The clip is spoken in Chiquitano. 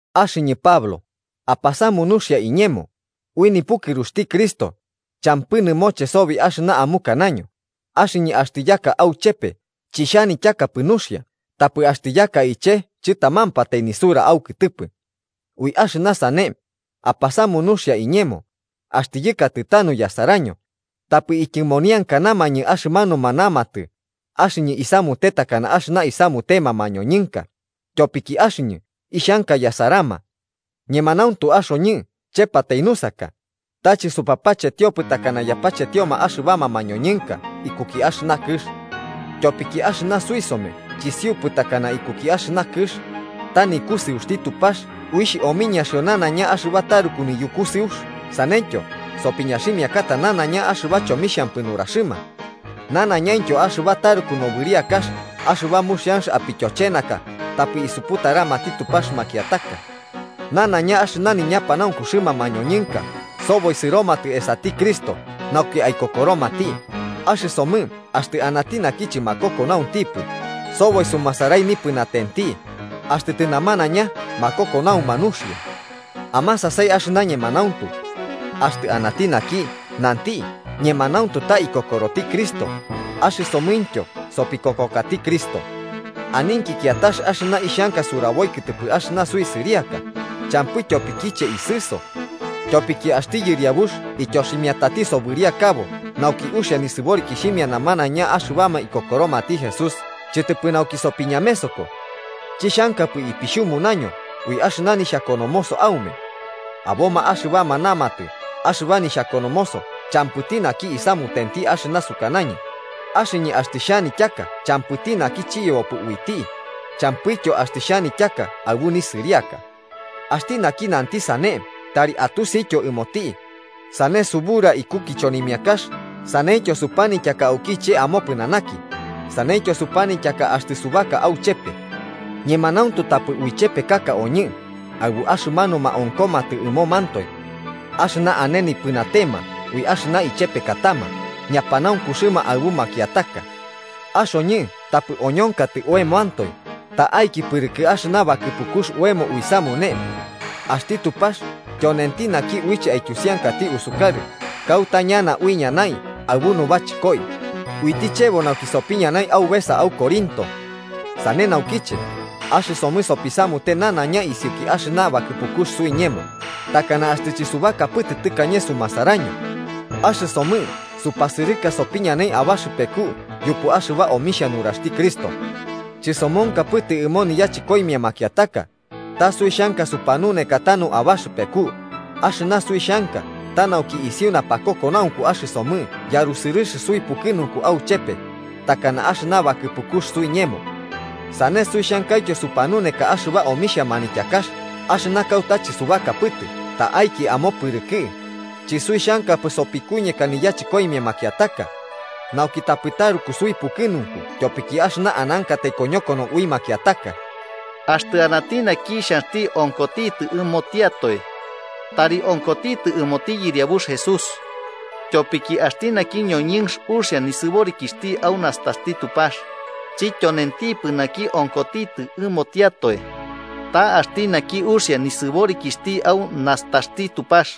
Axɨñɨ, Pablo, apasamu nuxia iñemo, ui nipukɨruxti Cristo, champɨ nɨmoche sobi axɨna amukanaño axɨñɨ axtɨ yaka auchepe chixhanityakapɨ nuxia tapɨ axtɨ yaka iche chɨtamampatai nisura aukɨtɨpɨ. Ui axɨna sane, apasamu nuxia iñemo, axtɨ yɨkatɨ tanu yasaraño, tapɨ ityɨmoniankanamañɨ axɨmanuma namatɨ axɨñɨ isamute takana axɨna isamutema mañoñɨnka, tyopiki axɨñɨ ixhanka yasarama. Ñemanauntu axoñɨ chepatai nusaka, ta chɨsupapachetiopɨ takana yapachetioma axɨbama mañoñɨnka ikuki axɨna kɨx. Tyopiki axɨna suisome chisiupɨ takana ikuki axɨna kɨx, ta nikusɨuxti Tupax uixh omiñaxio ñanaiña axɨba taruku niyukusɨux saneityo sopiñaximiakata nanaiña axɨba chomixhampɨ nuraxɨma. Nanaiñaintyo axɨba taruku nobɨriakax axɨba muxian apityochenaka tapɨ isuputaramati Tupax makiataka. Nanaiña axɨna niñapanaunkuxɨma mañoñɨnka soboi sɨromatɨ esati Cristo nauki aikokoromati, axɨsomɨ axtɨ anati naki chɨmakokonaunxtipɨ soboi sumasarai nipɨnatenti, axtɨ tɨnamanaiña makokonauma nuxia. Amasasai axɨna ñemanauntu. Axtɨ anati naki nanti ñemanauntu ta ikokoroti Cristo, axɨsomɨntyo sopikokokati Cristo. Aninki kiatax axɨna ixhanka suraboi kɨtɨpɨ axɨna suisɨriaka, champɨ tyopikiche isɨso. Tyopiki axti Yɨriabux ityoximiatati sobɨriakabo nauki uxia nisɨborikixhimia namanaiña axɨbama ikokoromati Jesús chɨtɨpɨ nauki sopiñamesoko. Chixhankapɨ ipixhumunaño ui axɨna nixhakonomoso aume. Aboma axɨbama namatɨ axɨba nixhakonomoso champɨti naki isamutenti axɨna sukanañɨ, axɨñɨ axtɨ xhanityaka champɨti naki chiyebopɨ uiti, champɨityo axtɨ xhanityaka aɨbu nisɨriaka. Axti naki nanti sane tari atusityo ɨmoti, sane subura iku kichonimiakax saneityo supanityaka auki iche amopɨnanaki, saneityo supanityaka axtɨ subaka auchepe. Ñemanauntu tapɨ uichepekaka oñɨ aɨbu axɨmanuma onkomatɨ ɨmomantoe. Axɨma ane nipɨnatema ui axɨna ichepekatama ñapanaunkuxɨma aɨbu makiataka. Axoñɨ tapɨ oñonkatɨ oemoantoe ta'aiki pɨrɨkɨ axɨna bakɨpukux oemo iusamune. Axti Tupax tyonenti naki uiche aityusiankati usukarɨ kauta ñana uiñanai aɨbu nubachɨkoi, uiti chebo nauki sopiñanai aubesa au Corinto. Sane naukiche, axɨsomɨ sopisamute nanaiña isiuki axɨna bakɨpukux suiñemo, takana axtɨ chɨsubakapɨtɨ tɨkañe sumasaraño. Axɨsomɨ supasɨrɨka sopiñanai abaxɨpeku yupu axɨba omixhia nuraxti Cristo. Chɨsomonkapɨtɨ ɨmo niyachɨkoimia makiataka, ta suixhanka supanuneka tanu abaxɨpeku, axɨna suixhanka ta nauki isiu napakokonaunku axɨsomɨ yarusɨrɨx suipukɨnunku auchepe, takana axɨna bakɨpukux suiñemo. Sane suixhankaityo supanuneka axɨba omixhia manityakax axɨna kauta chɨsubakapɨtɨ ta'aiki amopɨrɨkɨ, chisuixhankapɨ sopikuñeka niyachɨkoimia makiataka, nauki tapɨ taruku suipukɨnunku tyopiki axɨna anankatai koñokono ui makiataka. Axtɨ anati naki xhanxti onkotitɨ ɨmotiatoe, tari onkotitɨ ɨmoti Yɨriabux Jesús. Tyopiki axti naki ñoñɨnx uxia nisɨborikixhti au nastaxti Tupax, chityonentipɨ naki onkotitɨ ɨmotiatoe, ta axti naki uxia nisɨborikixhti au nastaxti Tupax.